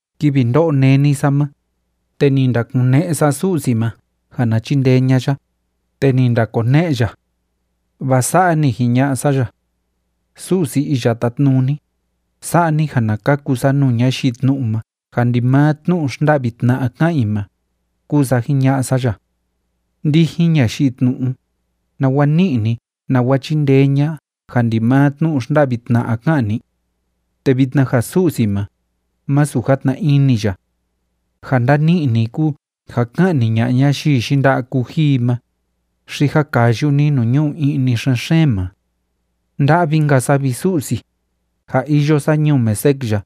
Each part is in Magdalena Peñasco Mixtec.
Kivi ndó'o néni sa ma, te ni ndakune'e sa Su'si ma ja na chindee ña'a ya, te ni ndakone'e ya. Vaa sa'a ni jiña'a sa ya: “Su'si Iya Tátnuni, sa'a ni ja na kaku sa nuu ñayii tnu'u ma ja ndimaa tnu'u xnda'vi tna'a ká'an i ma”, kúu sa jiña'a sa ya. Ndijin ñayii tnu'u, ¿nawa ni'i ni, nawa chíndee ña'a ja ndimaa tnu'u xnda'vi tna'a ká'an ni? Te vitna ja Su'si ma, masu játna ini ya. Ja ndani'i ni kúu ja ka'ni ña'a ñayii yinda'a kuji i ma, xi ja kayu ni nuu ñu'u i'ni xen‑xeen ma. ¡Nda'vi‑nka sa, vi Su'si, ja iyo sa ñuu Mesec ya,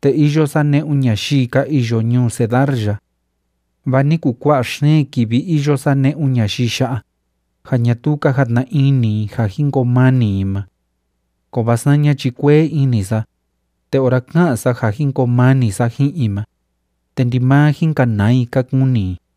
te iyo sa ne'un ñayii ka iyo ñuu Cedar ya! Vaa ni kuu kua'a xeen kivi iyo sa ne'un ñayii ya'a, ja ñatuu ka jatna ini i ja jin koo mani i ma. Kovaa saña chi kuee ini sa, te ora ká'an sa ja jin koo mani sa ji'in i ma, te ndimaa jin kanaa i ka kuni i.